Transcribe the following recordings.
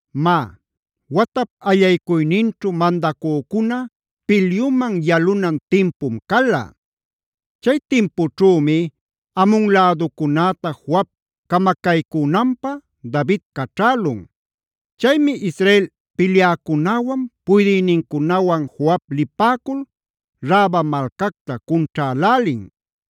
Má, watap allaycuyninćhu mandacücuna pilyuman yalunan timpum cala. Chay timpućhümi Amon läducunäta Joab camacaycünanpä David caćhälun. Chaymi Israel pilyäcunäwan puydïnincunawan Joab lipäcul Raba malcacta cunćhälälin.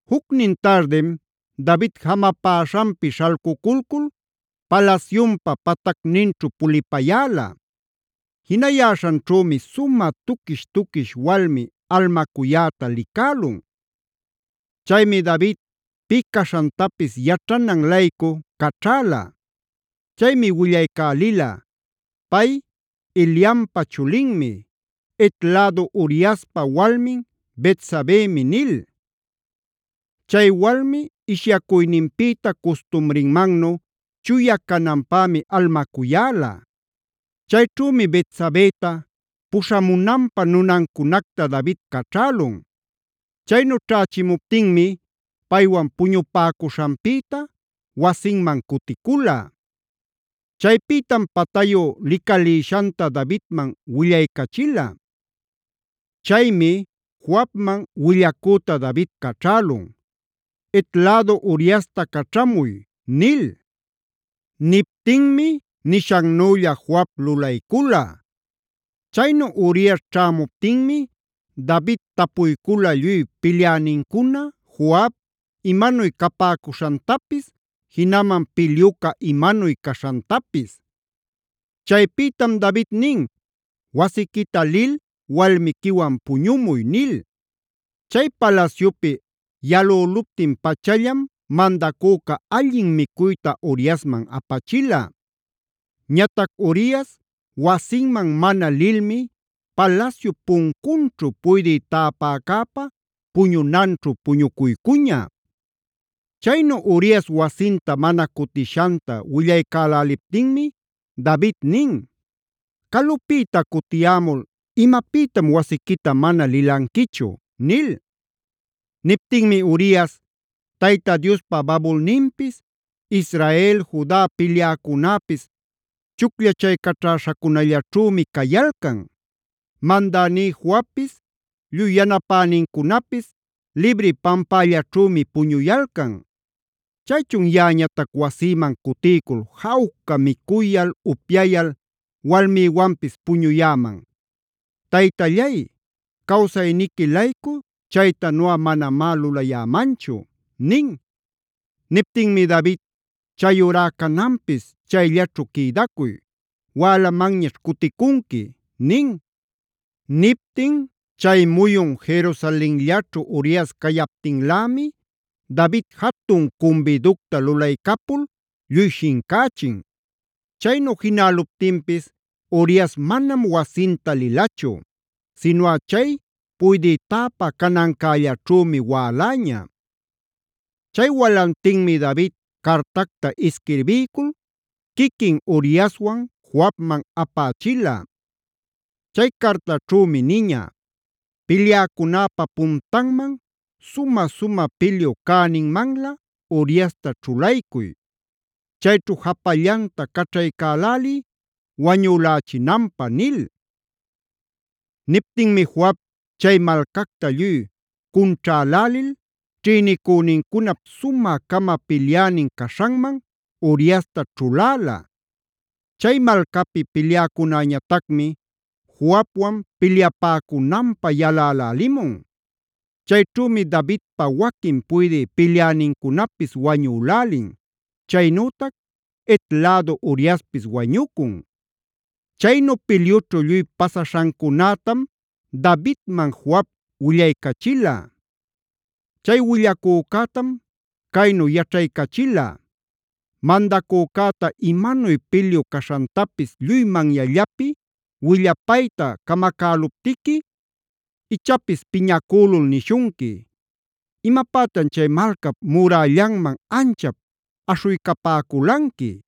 Jucnin tardim David jamapäśhanpi śhalcuculcul palasyunpa patacninćhu pulipayäla. Jinayäśhanćhümi sumä tuquish-tuquish walmi almacuyäta licälun. Chaymi David pï caśhantapis yaćhanan-laycu caćhäla. Chaymi willaycälila: “Pay Eliampa chulinmi, Het lädu Uriaspa walmin Betsabemi” nil. Chay walmi ishyacuyninpïta custumrinmannu chuya cananpämi almacuyäla. Chayćhümi Betsabeta puśhamunanpä nunancunacta David caćhälun. Chaynu ćhächimuptinmi paywan puñupäcuśhanpïta wasinman cuticula. Chaypïtam patayu licalïshanta Davidman willaycachila. Chaymi Joabman willacüta David caćhälun: “Het lädu Uriasta caćhamuy” nil. Niptinmi nishannülla Joab lulaycula. Chaynu Urias ćhämuptinmi David tapuycula lluy pilyänincuna, Joab, imanuy capäcuśhantapis, jinaman pilyuca imanuy caśhantapis. Chaypïtam David nin: “Wasiquita lil walmiquiwan puñumuy” nil. Chay palasyupi yalüluptin-pachallam mandacüca allin micuyta Uriasman apachila. Ñatac Urias wasinman mana lilmi palasyup puncunćhu puydï täpäcäpa puñunanćhu puñucuycuña. Chaynu Urias wasinta mana cutishanta willaycäläliptinmi David nin: “¿Calupïta cutiyämul imapïtam wasiquita mana lilanquichu?” nil. Niptinmi Urias: “Tayta Diospa babulninpis, Israel, Juda pilyäcunäpis chucllachaycaćhäśhacunallaćhümi cayalcan. Mandäní Joabpis, lluy yanapänincunapis libri pampällaćhümi puñuyalcan. ¿Chaychun yaꞌañatac wasïman cutiycul jawca micuyal, upyayal, walmïwanpis puñuyäman? ¡Taytallay cawsayniqui-laycu chaytanuꞌa manamá lulayämanchu!” nin. Niptinmi David: “Chayurá cananpis chayllaćhu quïdacuy; wälamanñaćh cuticunqui” nin. Niptin chay muyun Jerusalenllaćhu Urias cayaptinlämi, David jatun cumbiducta lulaycapul lluy shincächin. Chaynu jinäluptinpis Urias manam wasinta lilachu, sinuꞌa chay puydï täpä canancällaćhümi wäläña. Chay walantinmi David cartacta isquirbiycul quiquin Uriaswan Joabman apächila. Chay cartaćhümi niña: “Pilyäcunäpa puntanman, sumä-sumä pilyu cäninmanlä Uriasta ćhulaycuy. Chayćhu japallanta caćhaycäläliy wañülächinanpä” nil. Niptinmi Joab chay malcacta lluy cunćhälälil ćhïnicünincunap sumä-cama pilyänin caśhanman Uriasta ćhuläla. Chay malcapi pilyäcunäñatacmi Joabwan pilyapäcunanpä yalälälimun. Chayćhümi Davidpa waquin puydï pilyänincunapis wañülälin, chaynütac Het lädu Uriaspis wañucun. Chaynu pilyućhu lluy pasaśhancunätam Davidman Joab willaycachila. Chay willacücätam caynu yaćhaycachila: “Mandacücäta imanuy pilyu caśhantapis lluy manyallapi willapayta camacäluptiqui, ichapis piñacülul nishunqui: ‘¿Imapätan chay malcap murällanman anchap aśhuycapäculanqui?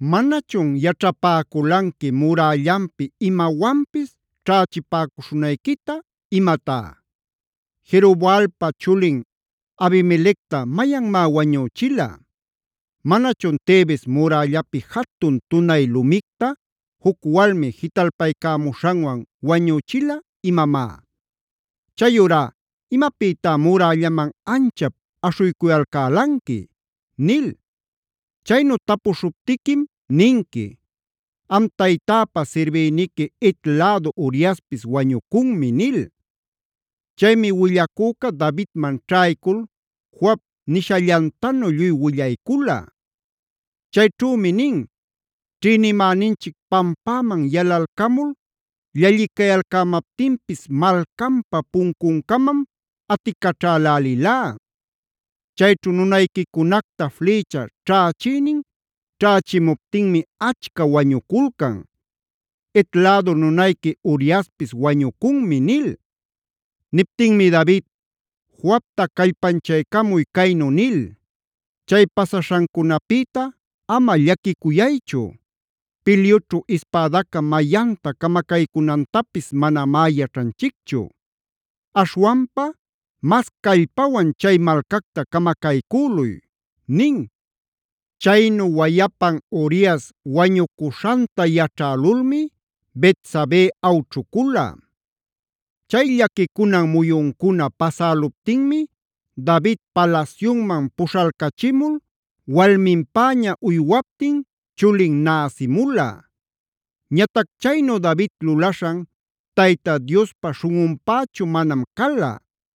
¿Manachun yaćhapäculanqui murällanpi imawanpis ćhächipäcuśhunayquita imatá? ¿Jerobaalpa chulin Abimelecta mayanmá wañüchila? ¿Manachun Tebes murällapi jatun tunay lumicta juc walmi jitalpaycämuśhanwan wañüchila imamá?b Chayurá ¿imapïtá murällaman anchap aśhuycuyalcälanqui?’ nil. Chaynu tapuśhuptiquim ninqui: ‘Am taytäpa sirbïniqui Het lädu Uriaspis wañucunmi’” nil. Chaymi willacüca Davidman ćhaycul Joab nishallantanu lluy willaycula. Chayćhümi nin: “Ćhïnimäninchic pampäman yalalcamul llallicayalcämaptinpis malcanpa puncuncamam aticaćhälälilá. Chayćhu nunayquicunacta flïcha ćhächïnin ćhächimuptinmi achca wañuculcan. Het lädu nunayqui Uriaspis wañucunmi” nil. Niptinmi David: “Joabta callpanchaycamuy caynu nil: ‘Chay pasaśhancunapïta ama llaquicuyaychu; pilyućhu ispadaca mayanta camacaycunantapis manamá yaćhanchicchu. Aśhwanpa mas callpawan chay malcacta camacaycüluy’” nin. Chaynu wayapan Urias wañucuśhanta yaćhälulmi Betsabé awćhucula. Chay llaquicunan muyuncuna pasäluptinmi David palasyunman puśhalcachimul walminpäña uywaptin chulin nasïmula. Ñatac chaynu David lulaśhan Tayta Diospa śhunꞌunpächu manam cala.